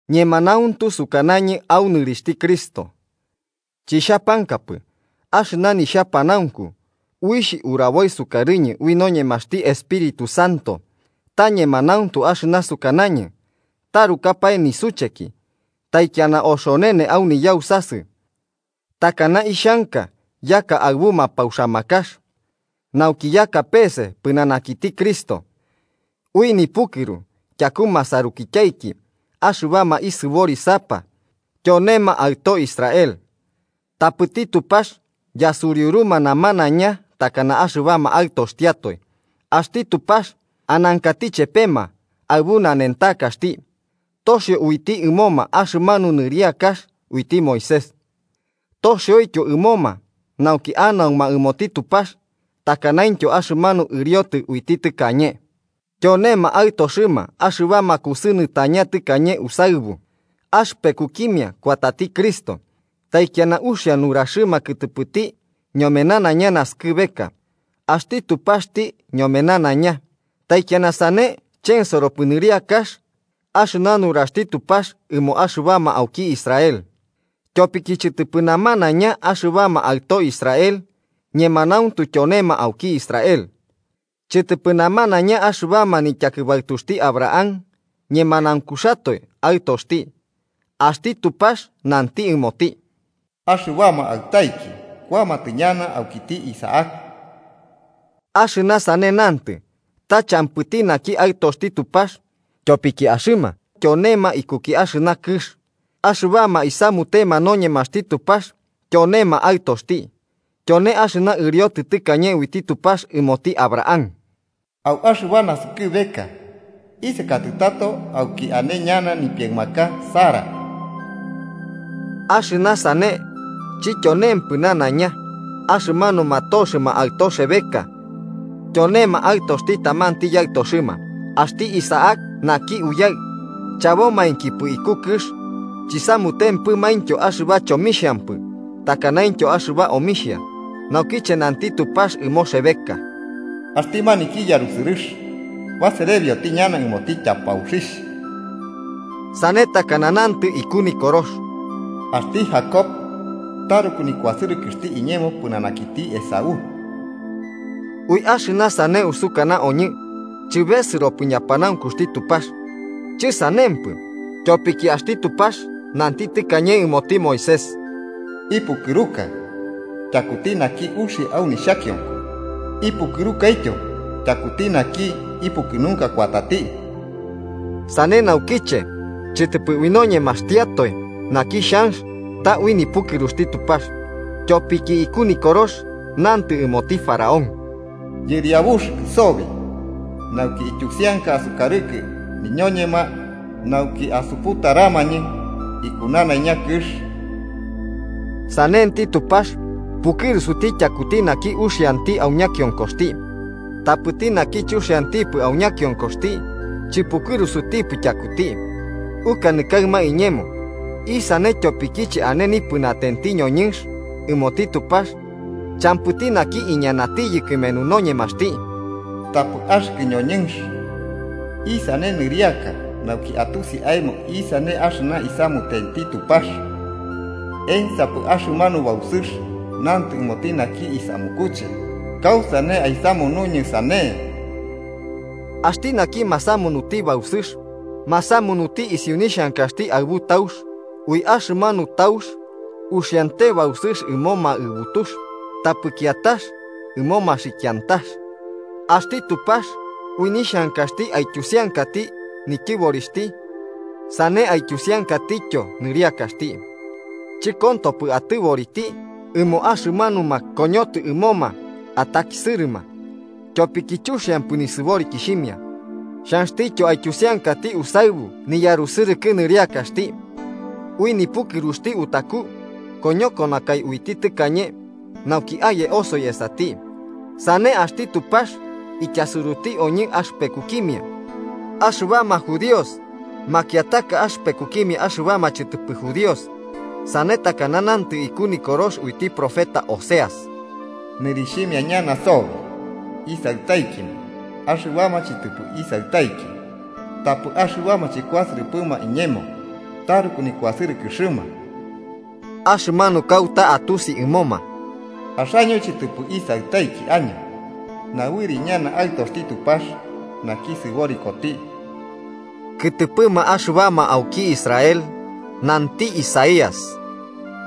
Ñemanauntu sukanañɨ au nɨrɨxhti Cristo, chixhapankapɨ, axɨna nixhapanaunku uixh uraboi sukarɨñɨ ui noñemaxti Espíritu Santo, ta ñemanauntu axɨna sukanañɨ tarukapae nisucheki, taikiana oxonene au niyausasɨ, takana ixhanka yaka aɨbu mapauxamakax, nauki yaka pese pɨnanakiti Cristo, ui nipukɨru tyaku masarukityaiki, axɨbama isɨborisapa. Tyonema aɨtoxti Israel, tapɨti Tupax yasuriuruma ñamanaiña takana axɨbama aɨtoxtiatoe, axti Tupax anankati chepema aɨbu nanentakaxti, toxio uiti ɨmoma axɨmanu nɨriakax uiti Moisés, toxioityo ɨmoma nauki anauma ɨmoti Tupax takanaintyo axɨmanu ɨriotɨ uiti tɨkañe. Tyonema aɨtoxɨma axɨbama kusɨnɨtaña tɨkañe usaɨbu. Axɨpekukimia kuatati Cristo, taikiana uxia nuraxɨma kɨtɨpɨti ñome nanaiña naskɨbeka, axti Tupaxti ñome nanaiña. Taikiana sane. Chensoropɨ nɨriakax axɨna nuraxti Tupax ɨmo axɨbama auki Israel. Tyopiki chɨtɨpɨ namanaiña axɨbama aɨtoxti Israel ñemanauntu tyonema auki Israel. Chɨtɨpɨ namanaiña axɨbama nityakɨbaɨtuxti Abraham ñemanaunkuxatoe aɨtoxti, axti Tupax nanti ɨmoti: “Axɨbama aɨtaiki kuamatɨ ñana aukiti Isaac.” Axɨna sane nantɨ ta champɨti naki aɨtoxti Tupax tyopiki axɨma tyonema ikuki axɨnantai kɨx. Axɨbama isamutema noñemaxti Tupax tyonema Aɨtoxti, tyone axɨna ɨriotɨ tɨkañe uiti Tupax ɨmoti Abraham: “Au axɨba naskɨbeka isekatɨ tato auki ane ñana nipiaɨmaka Sara.” Axɨna sane chityonempɨ nanaiña. Axɨmanuma toxɨma aɨto Rebeca, tyonema aɨtoxti tamanti yaɨtoxɨma, axti Isaac naki uyaɨ. Chabomainkipɨ iku kɨx, chisamutempɨmaintyo axɨba chomixhampɨ takanaintyo axɨba omixhia naukiche nanti Tupax ɨmo Rebeca: “Axti maniki yarusɨrɨx baserebioti ñana ɨmoti tyapauxixh.” Sane takana nantɨ iku Nikorox: “Axti Jacob taruku nikuasɨrɨkɨxti iñemo, pɨnanakiti Esaú.” ¿Ui axɨna sane usukana oñɨ chibesɨropɨ ñapanaunkuxti Tupax? ¡Chisanempɨ! Tyopiki axti Tupax nanti tɨkañe ɨmoti Moisés: “Ipukɨruka tyakuti naki uxia au nixhakionko, ipukurukaityo tyakuti naki ipukɨnunka kuatati.” Sane naukiche, chɨtɨpɨ ui noñemaxtiatoe naki xhanx ta ui nipukɨruxti Tupax. Tyopiki iku Nikorox nantɨ ɨmoti Faraón: “Yɨriabuxɨkɨ sobi nauki ityusianka asukarɨkɨ niñoñema nauki asuputaramañɨ iku nanaiña kɨx.” Sanenti Tupax pukɨrusuti tyakuti naki uxianti au ñakionkoxti, tapɨti naki chuxiantipɨ au ñakionkoxti chɨpukɨsutipɨ tyakuti. Ukanɨ kaɨma iñemo: “¿Isane tyopikiche ane nipɨnatenti ñoñɨnx ɨmoti Tupax champɨti naki iñanatiyɨ kɨmenu noñemaxti?” Tapɨ axɨkɨ ñoñɨnx, ¿isane nɨriaka nauki atusi aemo isane axɨna isamutenti Tupax? ¿Ensapɨ axɨmanu bausɨx nantɨ ɨmoti naki isamukuche: “Kausane aisamunuñɨ sane?” Axti naki masamunuti bausɨx masamunuti isiu nixhankaxti aɨbu taux, ui axɨmanu taux uxiante bausɨx ɨmo maɨbutux tapɨ kiatax ɨmo maxikiantax. Axti Tupax, ui nixhankaxti aityusiankati nityɨborixhti sane aityusiankatityo nɨriakaxti, chɨkontopɨ atɨboriti ɨmoma axɨmanuma koñotɨ ɨmoma atakisɨrɨma tyopiki chuxiampɨ nisɨborikixhimia. Xhanxtityo aityusiankati usaɨbu niyarusɨrɨkɨ nɨriakaxti, ui nipukɨruxti utaku koñokonokai uiti tɨkañe nauki aye osoi esati. Sane axti Tupax ityasuruti oñɨ axɨpekukimia axɨbama judíos makiataka axɨpekukimia axɨbama chɨtɨpɨ judíos. Sane takana nantɨ Nikorox uiti profeta Oseas: “Nɨrixhimia ñana sobi isaɨtaikimia axɨbama chɨtɨpɨ isaɨtaiki, tapɨ axɨbama chikuasɨrɨpɨma iñemo, taruku nikuasɨrɨkɨxɨma. Axɨmanu kauta atusi ɨmoma: ‘Axaño chɨtɨpɨ isaɨtaiki año’, nabɨri ñana aɨtoxti Tupax naki sɨborikoti.” Kɨtɨpɨma axɨbama auki Israel, nanti Isaías: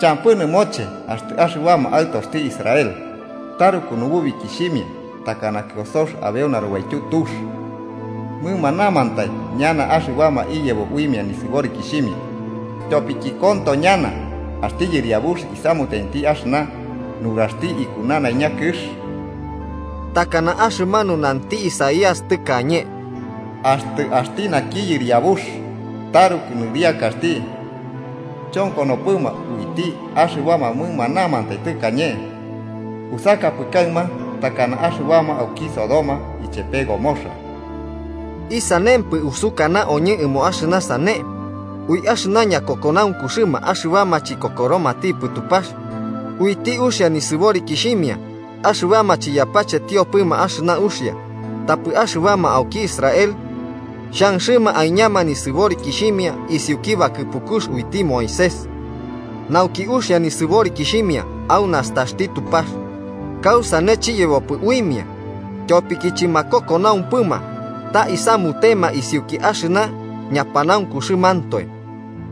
“Champɨ nɨmopche axtɨ axɨbama aɨtoxti Israel taruku nububikixhimia takana kɨosox abeu narubaityu tux, mɨmanamantai ñana axɨbama iyebo uimia nisɨborikixhimia, tyopiki konto ñana axti Yɨriabux isamutenti axɨna nuraxti iku nanaiña kɨx.” Takana axɨmanu nanti Isaías tɨkañe: “Axtɨ axti naki Yɨriabux taruku nɨriakaxti chonkonopɨma uiti axɨbama mɨmanamantai tɨkañe, usakapɨ kaɨma takana axɨbama auki Sodoma ichepe Gomorra.” ¿Isanempɨ usukana oñɨ ɨmo axɨna sane? Ui axɨna ñakokonaunkuxɨma axɨbama chikokoromatipɨ Tupax uiti uxia nisɨborikixhimia, axɨbama chiyapachetiopɨma axɨna uxia. Tapɨ axɨbama auki Israel, xhanxɨma aiñama nisɨborikixhimia isiuki bakɨpukux uiti Moisés, nauki uxia nisɨborikixhimia au nastaxti Tupax. ¿Kausane chiyebopɨ uimia? Tyopiki chimakokonaumpɨma ta isamutema isiuki axɨna ñapanaunkuxɨmantoe.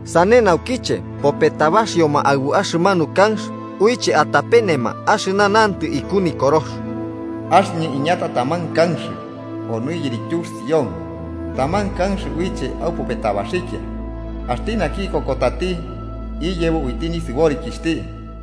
Sane naukiche popetabaxioma aɨbu axɨmanu “kanx uiche atapenema” axɨna nantɨ iku Nikorox: “Axɨnɨ iñata taman kanx onɨ yirityux Sión, taman kanx uiche aupopetabaxikia. Axti naki ikokotati, iyebo uiti nisɨborikixhti.”